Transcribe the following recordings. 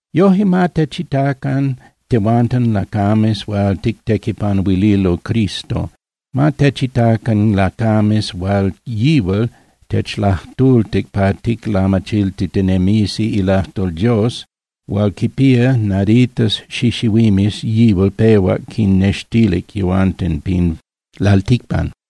Yoje, ma techitacan tehuanten lacames hual tictequipanuililo Cristo, ma techitacan lacames hual yihual techlajtultic pa ticlamachiltitinemisi ilajtol Dios hual quipía naditas xixihuimes yihual pehuac quinnextilic yehuanten pin lalticpan.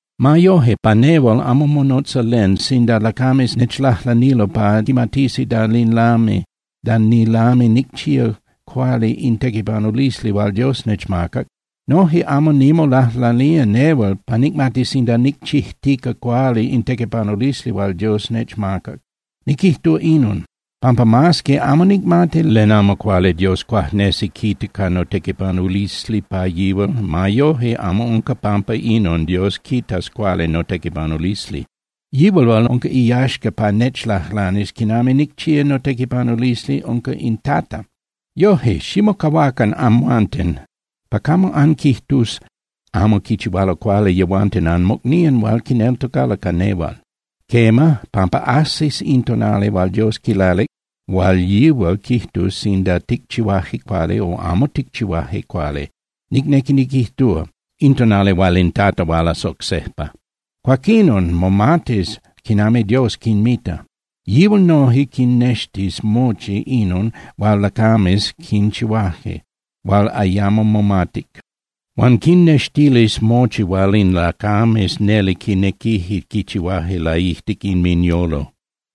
Ma yoje, pa nehual amo monotza len sinda lacames nechlajlanilo pa quimatisi da nilami nicchía cuali in tequipanulisli hual Dios nechmacac. Noje amo nimolajlanía nehual pa nicmatis sinda nicchijtica cuali in tequipanulisli hual Dios nechmacac. Niquijtúa inon, pampa mas que amo nicmati len amo cuali Dios cuajnesi quita ca notequipanulisli pa yihual, ma yoje amo unca pampa inon Dios quitas cuali notequipanulisli. Yihual hual unca iyaxca pa nechlajlanis quinami nicchía notequipanulisli unca in Tata. Yoje, ximocahuacan amhuanten pa camo anquijtus amo quichihualo cuali yehuanten anmocnían hual quineltocalo ca nehual. Quema, pampa ajsis in tonali hual Dios quilalic hual yihual quijtus sinda ticchihuaje cuali o amo ticchihuaje cuali, nicnequi niquijtúa, in tonali hual in Tata hualas oc sejpa. Cuaquinon momatis quinami Dios quinmita. Yihual noje quinnextis mochi inon hual lacames quinchihuaje hual ayamo momatic. Huan quinnextilis mochi hual in lacames neli quinequije quichihuaje laijtic inminyolo.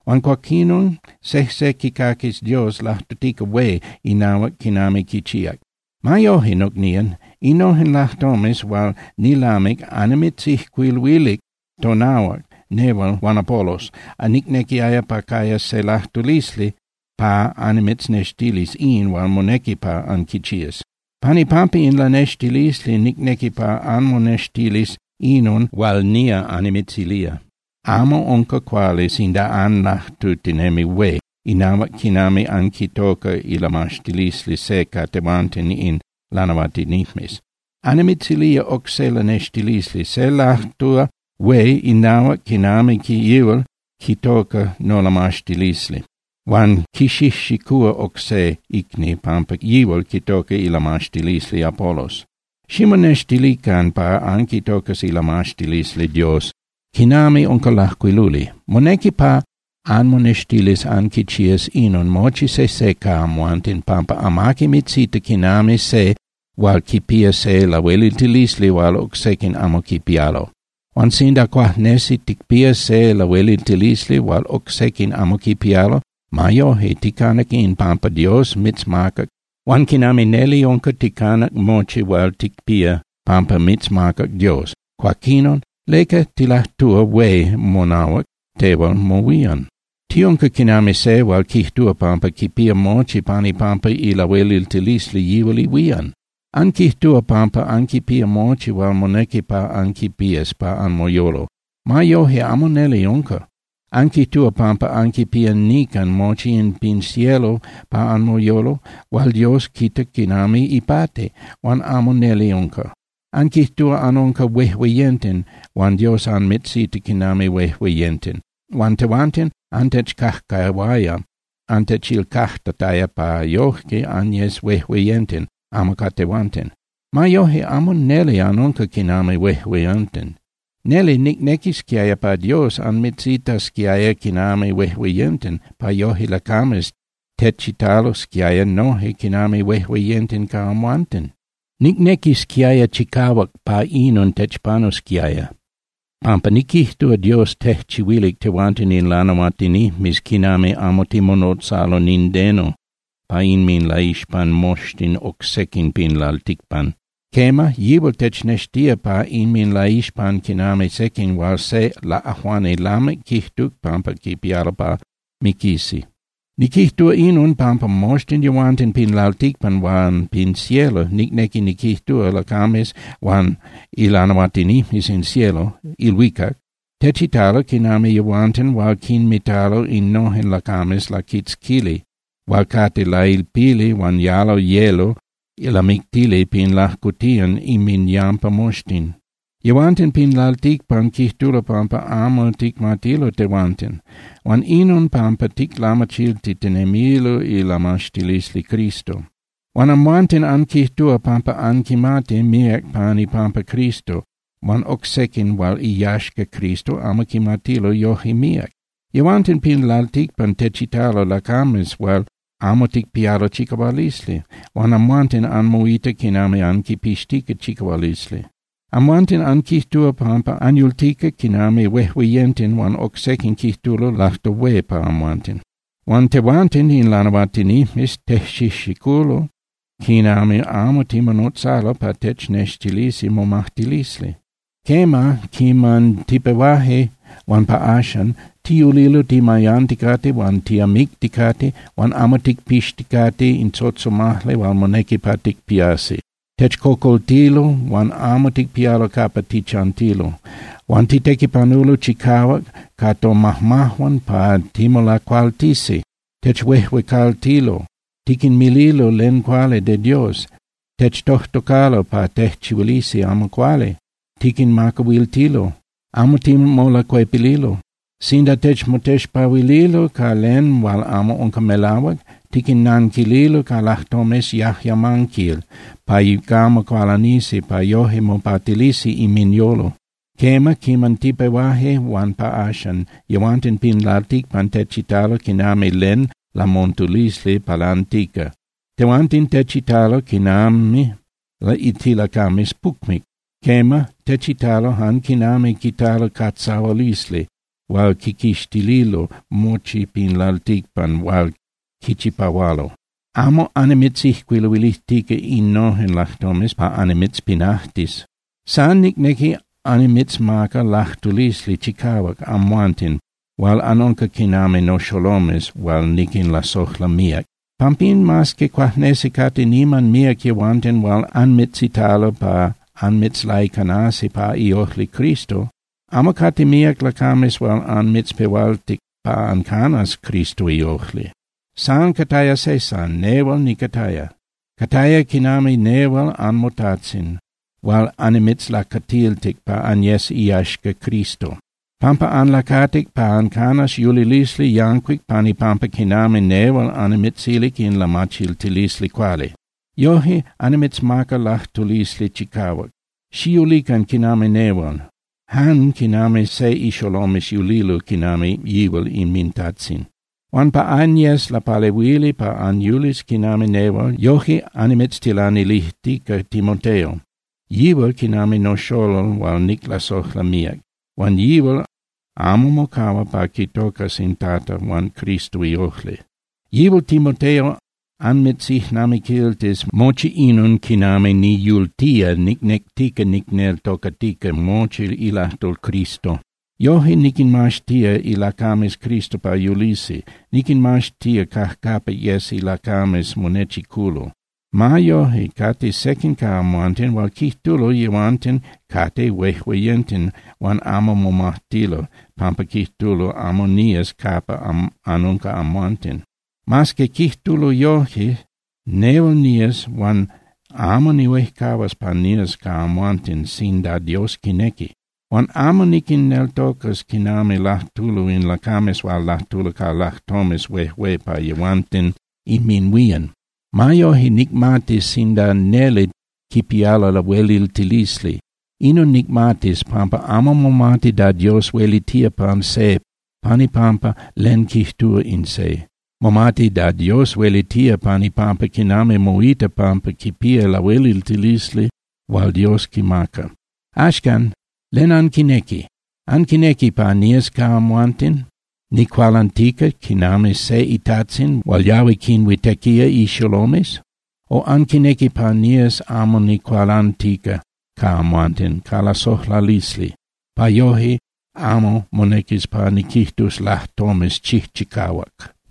Huan cuaquinon sejse quicaquis Dios lajtutica hué inahuac quinami quichíac. Ma yoje, nocnían, innojen lajtomes hual nilamic annimitzijcuiluilic tonahuac nehual huan Apolos nicnequiaya pa cayas se lajtulisli pa annimitznextilis in hual monequi pa anquichías. Pan ipampa in lanextilisli nicnequi pa anmonextilis inon hual nía annimitzilía: Amo unca cuali sinda anlajtutinemi hué inahuac quinami anquitoca ilamaxtilisli se ca tehuanten in lanahuatinijmes. Annimitzilía oc se lanextilisli. Se lajtúa hué inahuac quinami yihual quitoca nolamaxtilisli huan quixijxicúa oc se icni pampa yihual quitoca ilamaxtilisli Apolos. Ximonextilican pa anquitocas ilamaxtilisli Dios quinami unca lajcuiluli. Monequi pa anmonextilis anquichías inon mochi sejse ca amhuanten, pampa amaqui mitzita quinami se hual quipía se lahueliltilisli hual oc sequin amo quipialo. Huan sinda cuajnesi ticpía se lahueliltilisli hual oc sequin amo quipialo, ma yoje, ticanac in pampa Dios mitzmacac. Huan quinami neli unca ticanac mochi hual ticpía pampa mitzmacac Dios, cuaquinon ¿leca tilajtúa hué monahuac tehual mohuían? Tiunca quinami se hual quijtúa pampa quipía mochi pan ipampa ilahueliltilisli yihual ihuían. Anquijtúa pampa anquipía mochi hual monequi pa anquipías pa anmoyolo. Ma yoje amo neli unca. Anquijtúa pampa anquipía nican mochi in pin cielo pa anmoyolo hual Dios quita quinami ipati, huan amo neli unca. Anquijtúa anunca huejueyenten huan Dios anmitzita quinami huejueyenten. Huan tehuanten antechcajcahuaya antechilcajtataya pa yoje anyes huejueyenten amo ca tehuanten. Ma yoje, amo neli anunca quinami huejueyenten. Neli nicnequisquiaya pa Dios anmitzitasquiaya quinami huejueyenten pa yoje lacames techitalosquiaya noje quinami huejueyenten ca amhuanten. Nicnequisquiaya chicahuac pa inon techpanusquiaya, pampa niquijtúa Dios tejchihuilic tehuanten in lanahuatinijmes quinami amo timonotzalo nindeno pa inminlaixpan moxtin oc sequin pin lalticpan. Quema, yihual technextía pa inminlaixpan quinami sequin hual se laꞌajuani lamic quijtuc pampa quipialo pa miquisi. Niquijtúa inon, pampa moxtin yehuanten pin lalticpan huan pin cielo, nicnequi niquijtúa, lacames huan ilanahuatinijmes in cielo (ilhuicac) techitalo quinami yehuanten hual quinmitalo innojen lacames laquitzquili hual cate lailpili huan yalo yelo lamictili pin lajcotiyan inminyampa moxtin. Yehuanten pin lalticpan quijtulo pampa amo ticmatilo tehuanten, huan inon pampa ticlamachiltitinemilo ilamaxtilisli Cristo. Huan amhuanten anquijtúa pampa anquimati míac pan ipampa Cristo huan oc sequin hual iyaxca Cristo amo quimatilo yoje míac. Yehuanten pin lalticpan techitalo lacames hual amo ticpialo chicahualisli, huan amhuanten anmoita quinami anquipixtica chicahualisli. Amhuanten anquijtúa pampa anyultica quinami huejueyenten huan oc sequin quijtulo lajtol hué pa amhuanten. Huan tehuanten in lanahuatinijmes tejxijxiculo quinami amo timonotzalo pa technextilisi momajtilisli. Quema, quiman tipehuaje huan pa axan, tiyulilo timayanticate huan tiamicticate huan amo ticpixticate in tzotzomajli hual monequi pa ticpiasi. Techcocoltilo huan amo ticpialo capa tichantilo. Huan titequipanulo chicahuac ca tomajmajuan pa timolacualtisi. Techhuejuecaltilo, tiquinmililo len cuali de Dios. Techtojtocalo pa tejchihuilisi amo cuali, tiquinmacahuiltilo, amo timolacuepililo. Sinda techmotexpahuililo ca len hual amo unca melahuac, tiquinnanquililo ca lajtomes yajyamanquil pa camo cualanisi pa yoje mopatilisi inminyolo. Quema, quiman tipehuaje huan pa axan, yehuanten pin lalticpan techitalo quinami len lamontulisli palantica, tehuanten techitalo quinami tilacames pucmic. Quema, techitalo jan quinami quitalo catzahualisli hual quiquixtililo mochi pin lalticpan hual quichipahualo. Amo annimitzijcuiluilijtica innojen lajtomes pa annimitzpinajtis. San nicnequi annimitzmaca lajtulisli chicahuac amhuanten hual anunca quinami noxolomes hual niquinlasojla míac. Pampín, mas que cuajnesi cate niman míac yehuanten hual anmitzitalo pa anmitzlaicanasi pa iojli Cristo, amo cate míac lacames hual anmitzpehualtic pa ancanas Cristo iojli. San cataya se san, nehual nicataya. Cataya quinami nehual anmotajtzin hual annimitzlacatiltic pa anyes iyaxca Cristo, pampa anlacatic pa ancanas yulilisli yancuic pan ipampa quinami nehual annimitzilic in lamachiltilisli cuali. Yoje, annimitzmaca lajtulisli chicahuac, xiyulican quinami nehual, jan quinami se ixolomes yulilo quinami yihual inmintajtzin. Huan pa anyes lapalehuili pa anyulis quinami nehual, yoje annimitztilanilijtica Timoteo. Yihual quinami noxolol hual niclasojla míac, huan yihual amo mocahua pa quitocas in Tata huan Cristo iojli. Yihual Timoteo anmitzijnamiquiltis mochi inon quinami niyultía nicnectica nicneltocatica mochi ilajtol Cristo. Yoje niquinmaxtía ilacames Cristo pa yulisi, niquinmaxtía cajcapa yes ilacames monechiculo. Ma yoje, cate sequin ca amhuanten hual quijtulo yehuanten cate huejueyenten huan amo momajtilo, pampa quijtulo amo nías capa anunca amhuanten. Mas que quijtulo yoje, nehual nías huan amo nihuejcahuas pa nías ca amhuanten sinda Dios quinequi. Huan amo niquinneltocas quinami lajtulo in lacames hual lajtulo ca lajtomes huejué pa yehuanten inminhuían. Ma yoje, nicmatis sinda neli quipialo lahueliltilisli. Inon nicmatis, pampa amo momati da Dios huelitía pan se pan ipampa len quijtúa in se. Momati da Dios huelitía pan ipampa quinami moita pampa quipía lahueliltilisli hual Dios quimaca. Axcan, ¿len anquinequi? ¿Anquinequi pa nías ca amhuanten nicualantica quinami se itajtzin hual yahui quinhuitequía ixolomes? O ¿anquinequi pa nías amo nicualantica ca amhuanten ca lasojlalisli, pa yoje amo monequis pa niquijtus lajtomes chijchicahuac?